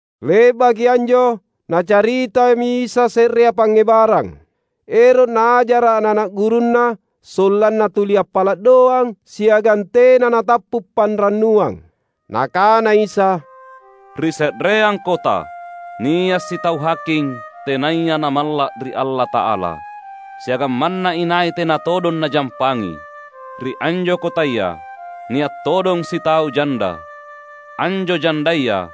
Le’baki anjo Nacaritami Isa se’rea pangngebarang, ero’ Naajara’ ana’-ana’ gurunNa sollanna tuli appala’ doang siagang tena natappu’ panrannuang. Nakana Isa, "Ri se’reang kota, nia’ sitau haking, tenaya namalla’ ri Allata’ala, siagang manna inai tena todong najampangi. Ri anjo kotaya, nia’ todong sitau janda. Anjo jandaya,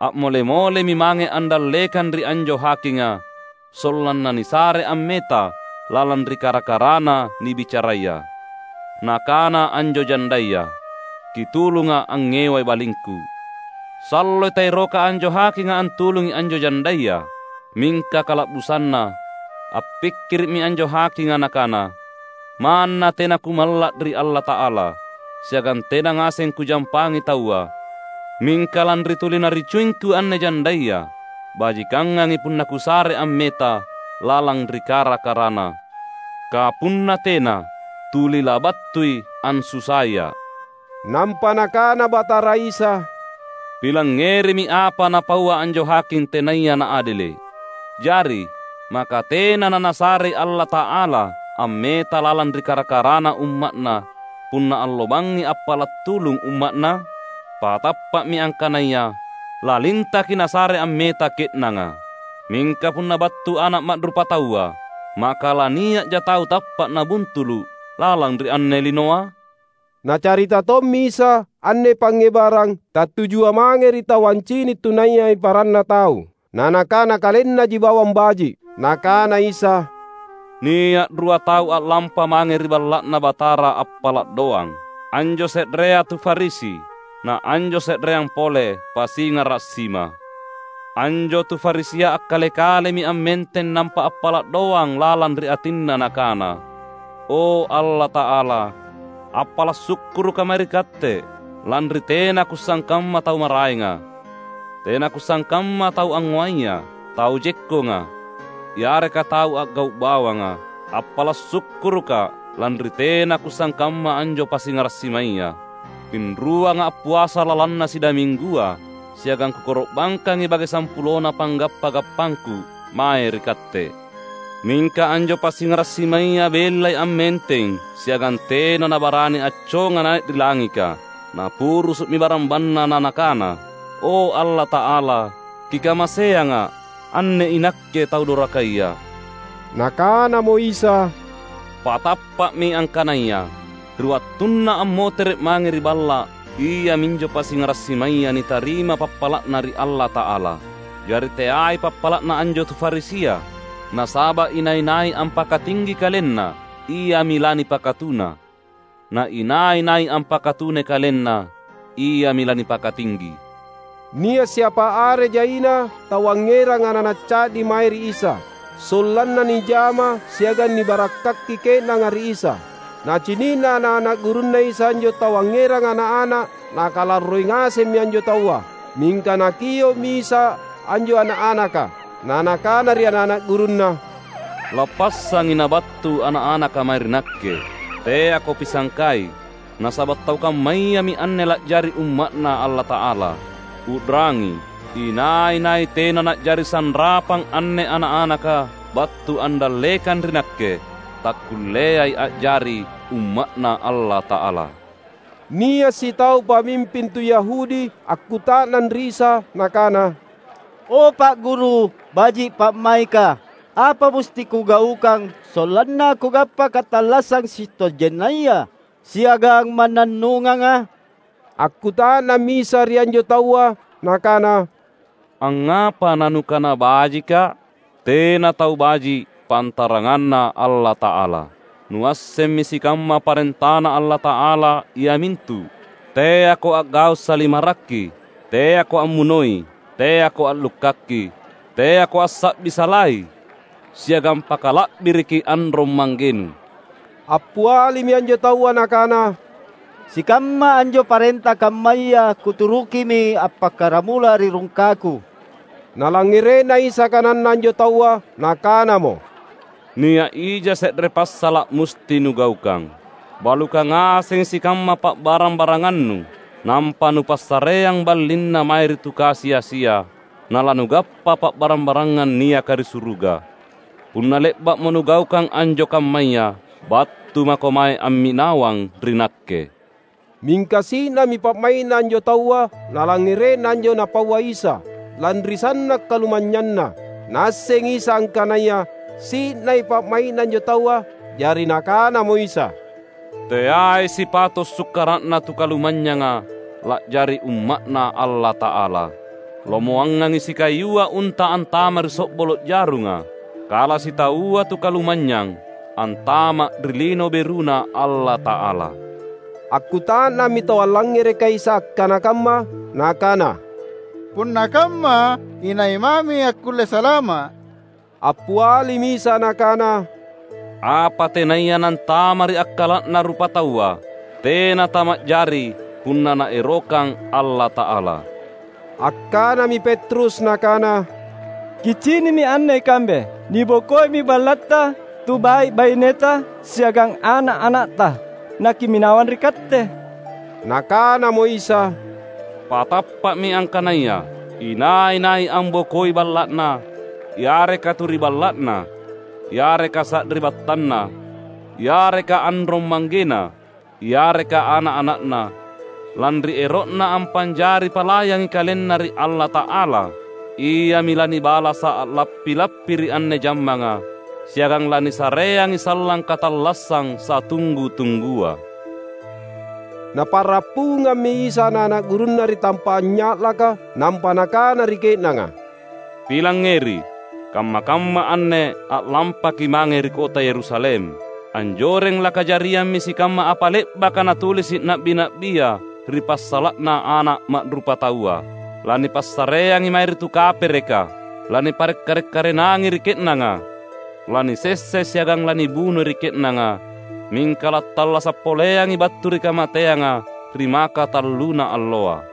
a’mole-molemi mange andallekang ri anjo hakinga, sollanna nisare ammeta lalang ri kara-karana nibicaraya. Nakana anjo jandaya, ‘Kitulunga’ angngewai balingku.’ Salloi taeroka anjo hakinga antulungi anjo jandaya. Mingka kala’busanna appikkiri’mi anjo hakinga nakana, ‘Manna tena kumalla’ ri Allata’ala, siagang tena ngaseng kujampangi taua, mingka lanri tuli naricuingku anne jandaya, bajikangangi punna kusare ammeta lalang ri kara-karana. Kapunna tena, tuli labattui ansusaia’.’" Nampa Nakana Batara Isa, "Pilangngerimi apa napaua anjo haking tenaya naadele’. Jari, maka tena naNasarei Allata’ala ammeta lalang ri kara-karana umma’Na, punna allo bangngi appala’ tulung umma’Na? Patappa’mi angkanaya: Lalintaki Nasare ammeta ke’nanga! Mingka punna battu Ana’ Ma’rupataua, maka lania’ja tau tappa’ nabuntulu’ lalang ri anne linoa?" Nacarita tommi Isa anne pangngebarang tattujua mange ri tau ancini’ tunayai paranna tau, na nakana kalennaji bawang baji’. Nakana Isa, "Nia’ rua tau a’lampa mange ri Balla’Na Batara appala’ doang. Anjo se’rea tu Farisi, na anjo se’rea pole pasingara’ sima. Anjo tu Farisia akkale-kalemi ammenteng nampa appala’ doang lalang ri atinna nakana, ‘O, Allata’ala, appala’ sukkurukka’ mae ri Katte, lanri tena kusangkamma tau maraenga; tena kusangkamma tau angngoaya, tau jekkonga, yareka tau a’gau’ bawanga. Appala’ sukkurukka’, lanri tena kusangkamma anjo pasingara’ simaya. Pinruanga’ appuasa lalanna sidaminggua, siagang kukoro’bangkangi bage sampulona panggappa-gappangku mae ri Katte.’ Mingka anjo pasingara’ simaya bellai ammenteng siagang tena nabarani acconga nai’ ri langika. Napurusu’mi barambanna na nakana, ‘O, Allata’ala, Kikamaseanga’, anne inakke tau dorakaya!’" Nakanamo Isa, "Patappa’mi angkanaya, ri wattunna ammotere’ mange ri balla’, iaminjo pasingara’ simaya nitarima pappala’na ri Allata’ala. Jari teai pappala’na anjo tu Farisia. Nasaba’ inai-nai ampakatinggi kalenna iami lanipakatuna. Na inai-nai ampakatunai kalenna, iami lanipakatinggi." Nia’ siapa are jaina tau angngerang ana’-ana’ ca’di mae ri Isa, sollanna nijama siagang nibarakkaki ke’nanga ri Isa. Nacini’na ana’-ana’ gurunNa Isa anjo tau angngeranga ana’-ana’, nakalarroi ngasemmi anjo taua. Mingka Nakio’mi Isa, anjo ana’-anaka na Nakana ri ana’-ana’ gurunNa, "Lappassangi nabattu ana’-anaka mae ri Nakke! Teako pisangkai, nasaba’ tau kammayami anne la’jari umma’Na Allata’ala. U’rangi! Inai-nai tena na’jari sanrapang anne ana’-anaka battu andallekang ri Nakke, takkulleai a’jari umma’Na Allata’ala." Nia’ sitau pamimping tu Yahudi akkuta’nang ri Isa nakana, "O, Pa’ Guru, baji’ pa’maika, apa musti kugaukang sollanna kugappa katallassang sitojennaya siagang mannannunganga?" Akkuta’nammi Isa ri anjo taua Nakana, "Angngapa nanukana bajikKa’? Tena tau baji’ pantaranganna Allata’ala. Nuassemmi sikamma parentaNa Allata’ala, iamintu, ‘Teako a’gau’ salimarri, teako ammunoi, teako a’lukkaki, teako assa’bi salai, siagang pakala’biriki anrong-manggenu.’" Appialimi anjo taua nakana, "Sikamma anjo parenta kammaya kuturukimi appakkaramula ri rungkaku." Nalangngere’na Isa kananna anjo taua, Nakanamo, "Nia’ ija se’re passala’ musti nugaukang: Balukang ngasengi sikamma pa’barang-barangannu, nampa nupassareang ballinna mae ri tu kasi-asia, na lanugappa pa’barang-barangang niaka ri suruga. Punna le’ba’mo nugaukang anjo kammaya, battu mako mae amminawang ri Nakke." Mingka si’nami pa’mai’na anjo taua nalangngere’na anjo Napaua Isa, lanri sanna’ kalumanynyanna. Naassengi Isa angkanaya si’nai pa’mai’na anjo taua. Jari Nakanamo Isa, "Teai sipato’ sukkara’na tu kalumanynyanga la’jari umma’Na Allata’ala! Lomoangangi sikayua unta antama’ ri so’bolo’ jarunga, kala sitaua tu kalumanynyang antama’ ri Lino BeruNa Allata’ala." Akkuta’nammi tau allangngerekai Isa akkana kamma nakana, "Punna kamma, inai mami akkulle salama’?" Appialimi Isa Nakana, "Apa tenaya nantama’ ri akkala’na rupataua, tena tama’jari punna Naerokang Allata’ala!" Akkanami Petrus nakana, "Kicini’mi anne ikambe! Nibokoimi ballatta, tu bai’-baineta siagang ana’-anatta, nakimminawang ri Katte!" Nakanamo Isa, "Patappa’mi, angkanaya: Inai-nai ambokoi balla’na, yareka tu ri balla’na, yareka sari’battanna, yareka anrong-manggena, yareka ana’-ana’na, lanri ero’na ampa’jari palayangi kalenna ri Allata’ala, iami lanibalasa’ a’lappi-lappi ri anne jammanga, siagang lanisareangi sallang katallassang satunggu-tunggua." Napa’rappungammi Isa ana’-ana’ gurunNa ri tampa’ anynya’laka. Nampa Nakana ri ke’nanga, "Pilangngeri! Kamma-kamma anne a’lampaki’ mange ri kota Yerusalem. Anjoreng lakajariammi sikamma apa le’baka natulisi’ na’bi-na’bia ri passala’na Ana’ Ma’rupataua. Lanipassareangi mae ri tu kapereka, lanipare’ kare’-karenangi ri ke’nanga. Lanisessai siagang lanibunoi ri ke’nanga, mingka lattallasa’ poleangi battu ri kamateanga ri makatalluna alloa."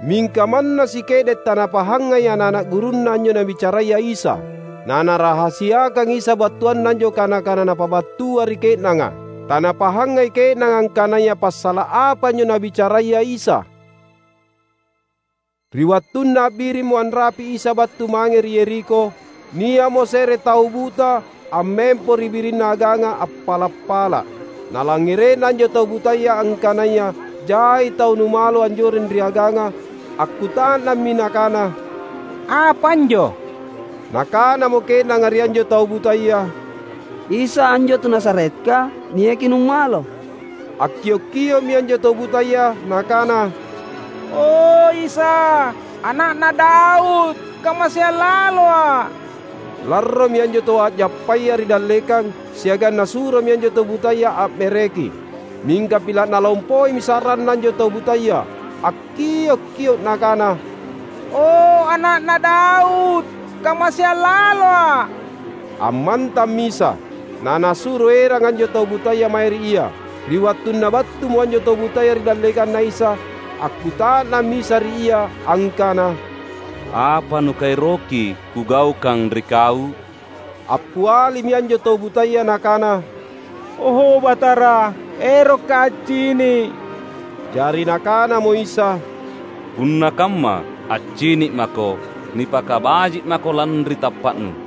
Mingka manna sike’de’ tanapahangai ana’-ana’ gurunNa anjo Nabicaraya Isa. Na Narahasiakang Isa battuanna anjo kana-kana Napabattua ri ke’nanga. Tanapahangai ke’nanga angkanaya passala’ apa anjo Nabicaraya Isa. Ri wattunna a’birimmo anrapi’ Isa battu mange ri Yerikho, nia’mo se’re tau buta ammempo ri birinna aganga appala’-pala’. Nalangngere’na anjo tau butaya angkanaya jai tau numalo anjoreng ri aganga, akkuta’nammi nakana, "Apa anjo?" Nakanamo ke’nanga ri anjo tau butaya, "Isa, anjo tu Nazaretka, niaki numalo." Akkiok-kio’mi anjo tau butaya nakana, "O Isa, Ana’na Daud! Kamaseang laloa’!" Larromi anjo tau a’jappaya ri dallekang siagang nasuromi anjo tau butaya a’mereki. Mingka pila’ nalompoimi sa’ranna anjo tau butaya, akkiok-kio’ nakana, "O, Ana’na Daud! Kamaseang laloa’!" Ammantammi Isa, na Nasuro erang anjo tau butaya mae ri Ia. Ri wattunna battumo anjo tau butaya ri dallekanNa Isa, akkuta’nammi Isa ri ia angkana, "Apa nukaeroki Kugaukang ri kau?" Appialimi anjo tau butaya nakana, "O Batara, erokka’ accini’." Jari Nakanamo Isa, "Punna kamma, accini’ mako! Nipakabaji’ mako lanri tappa’nu."